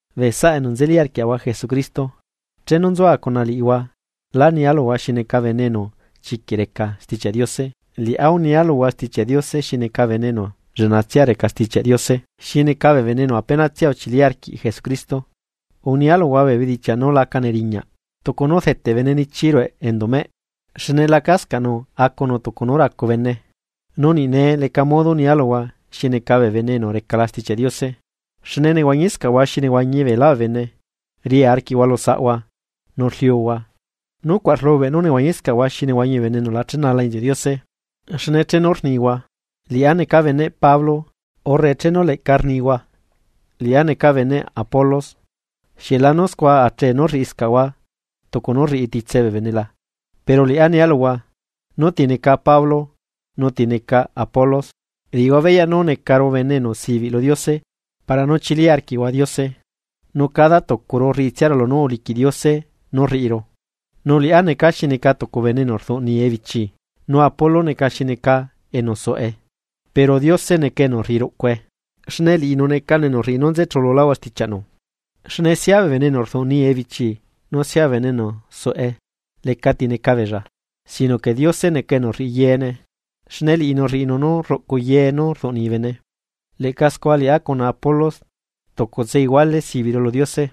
Bee saꞌa enu nzeli arquiaꞌahua Jesucristo, chenu nzua cuna liꞌihua lá nia luhua xi neca bene enu chiquiꞌ reca Stichiaꞌ Diose, liꞌá unia luhua Stichiaꞌ Diose xi neca bene enu lleꞌnatsia reca Stichiaꞌ Diose xi neca bee bene enu apenatsia uchili arquiꞌ Jesucristo. Unia luhua bee bedichiaꞌ nú laca neriñaꞌ, tucu nú rdeteꞌ bene nichi rueꞌ enduꞌ meꞌ, xne lacascaꞌnu acunu tucu nú racu bene. Nu niꞌ nee leca modo nia luhua xi neca bee bene enu recala Stichiaꞌ Diose, xne nehuañiscaꞌhua xi nehuañi beelá bee bene, ria arquiꞌhua lu saꞌhua nu rliuhua, nucuaꞌ rlubeꞌ nú nehuañiscaꞌhua xi nehuañi bee bene enu la chenala inziuꞌ Diose. Xne chenu rnihua: “Liꞌá neca beneꞌ Pablo”, urre chenu leꞌca rnihua: “Liꞌá neca beneꞌ Apolos”, ¿xieꞌ lanu scua achee nú rriꞌiscaꞌhua tucu nú rriꞌi titse bee bene la? Pero liꞌá nia luhua: ¿Nú tineca Pablo nu tineca Apolos? Rriꞌihua beyaꞌ nú necaru bee enu sibiꞌ lu Diose para nú uchili arquiꞌhua Diose, nu cada tucuru rriꞌitsia lunú uliquiꞌ Diose nú rriꞌiru. Nu liꞌá necaa xi neca tucu bene enu rduꞌnii ebichi, nu Apolos neca xi neca enu suꞌe, pero Diose neca enu rriꞌi ruꞌcue. Xne liꞌinu necanu enu rriꞌi nú nzechululáhua stichiaꞌnu. Xne sia bene enu rduꞌnii ebichi nu sia bene enu suꞌe lecati neca beella. Sino que Diose neca enu rriꞌi yeene, xne liꞌinu rriꞌinu nú rruꞌcu ye nú rduꞌnii bene. Leꞌca scua liꞌá cuna Apolos tucutse iguale sibiꞌru lu Diose,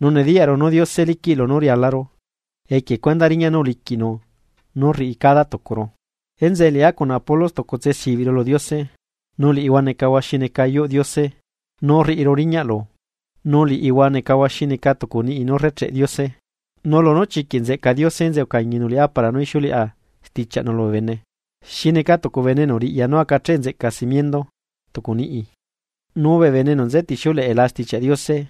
nu nediyaꞌru nú Diose liquiꞌ lunú rialaru equie cuendaꞌ riñaꞌ nú uliquiꞌnu nú rriꞌi cada tucuru. Enzeꞌe liꞌá cuna Apolos tucutse sibiꞌru lu Diose. Nu liꞌihua necahua xi neca yuꞌ Diose nú rriꞌiru riñaꞌlu, nu liꞌihua necahua xi neca tucu niꞌi nú rrecheꞌ Diose. Nu lunú chiquiꞌ nzeꞌca Diose enzeꞌe ucañinu liꞌá para nú ixiuleꞌa stichiaꞌnu lubee bene. Xi neca tucu bene enu riꞌya nú acacheꞌ nzeꞌca simiendoꞌ tucu niꞌi. Nu bee bene enu nzetixiuleꞌela Stichiaꞌ Diose,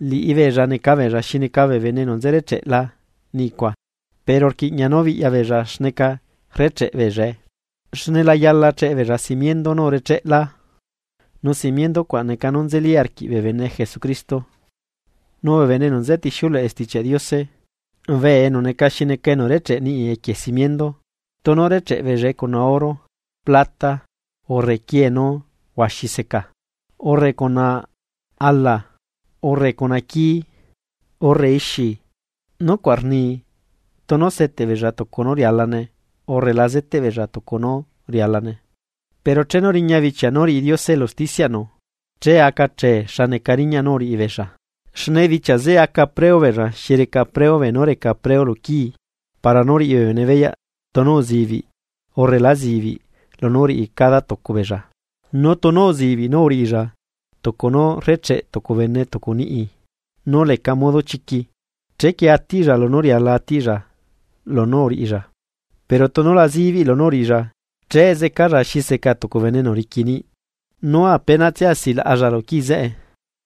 liꞌibeella neca beella xi neca bee bene enu nze recheꞌla niꞌicua. Pero rquiꞌña nú biꞌya beella xneca rrecheꞌ beellae. Xne la yala cheꞌe beella simiendo nú urecheꞌlá, nu simiendo cuaꞌ neca nú nzeli arquiꞌ bee bene Jesucristo. Nu bee bene enu nzetixiuleꞌe Stichiaꞌ Diose, bee enu neca xi neca enu recheꞌe niꞌi equie simiendo, tunu recheꞌ beellae cuna oro, plata, urre quie nú huaxi seca, urre cuna ala, urre cuna quii, urre ixi, nucuaꞌ rni tunu seteꞌ beella tucu nú rialane urre la zeteꞌ beella tucu nú rialane. Pero chenu riña bichia nú riꞌi Diose elu usticiaꞌnu, che aca chee xa neca riñaꞌ nú uriꞌibeella. Xne bichia zeꞌe aca preu beella xi reca preu beenú reca preu luquii para nú riꞌi bee bene beyaꞌ tunu uzibiꞌ urre lá zibiꞌ lunú uriꞌi cada tucu beella. Nu tunu uzibiꞌ nú uriꞌilla tucu nú rrecheꞌ tucu bene tucu niꞌi nú leca modo chiqui, chequie atiꞌlla lunú riala atiꞌlla lunú uriꞌilla. Pero tunu la zibiꞌ lunú uriꞌilla, che zecalla xi seca tucu bene enu riqui niꞌ nu apenatsia silaꞌalla lu quii zeꞌe,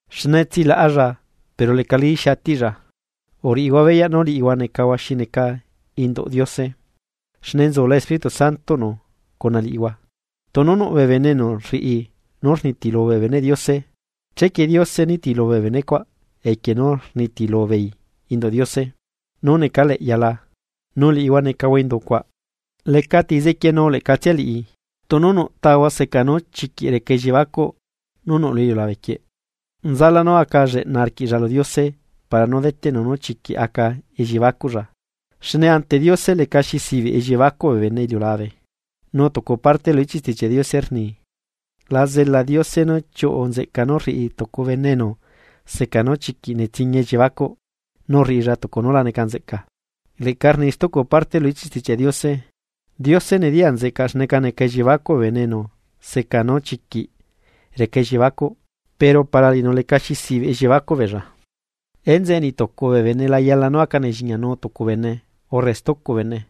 xne tsilaꞌalla pero lecalí xi atiꞌlla. Uriꞌihua beyaꞌ nú liꞌihua necahua xi neca induꞌ Diose, xne nzula Espíritu Santoꞌnu cuna liꞌihua. Tunu nuꞌ bee bene enu rriꞌi nú rnitilu bee beneꞌ Diose, chequie Diose nitilu bee benecuaꞌ equie nú rnitilu beei induꞌ Diose nú necaleꞌyala, nu liꞌihua necahua indu cuaꞌ. Lecati zequienu leꞌcatsia liꞌi: Tunu nuꞌ tahua seca nú chiquiꞌ reca elliebacuꞌ nú nuꞌ lu iliulabe quieꞌ, nzalá nú aca lleꞌna arquiꞌlla lu Diose para nú deteꞌnu nú chiquiꞌ aca elliebacuꞌlla. Xne ante Diose lecaxi zibiꞌ elliebacuꞌ bee bene iliulabe, nu tucu parte lu ichiꞌ Stichiaꞌ Diose rni: “La zela Diose nú chiuꞌu nzeꞌca nú rriꞌi tucu bene enu seca nú chiquiꞌ netsiñia elliebacuꞌ nú rriꞌilla tucu nú la neca nzeꞌca.” Leꞌca rni stucu parte lu ichiꞌ stichiaꞌnu: “Diose nediyaꞌ nzeꞌcaꞌ xneca neca elliebacuꞌ bee bene enu seca nú chiquiꞌ reca elliebacuꞌ pero para liꞌinu lecaxi zibiꞌ elliebacuꞌ beella.” Enzeꞌe niꞌtucu bee bene la yala nú aca nelliñianu tucu bene urre stucu bene.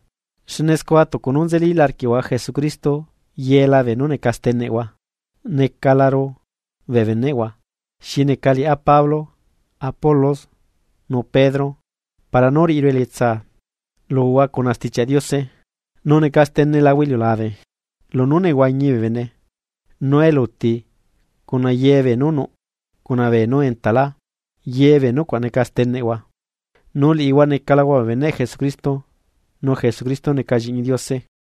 Xne scua tucu nú nzelila arquiꞌhua Jesucristo yela beenú neca steneꞌhua. Necalaru bee beneꞌhua, xi neca liꞌá Pablo, Apolos nu Pedro para nú riꞌiru elietsa luhua cuna Stichiaꞌ Diose, nu neca stenelahua iliulabe, lunú nehuañi bee bene, nu eluti cuna ye beenú nuꞌ cuna beenú entalá, ye bee nucuaꞌ neca steneꞌhua. Nu liꞌihua necalahua bee beneꞌ Jesucristo, nu Jesucristo neca Lliꞌñi Diose.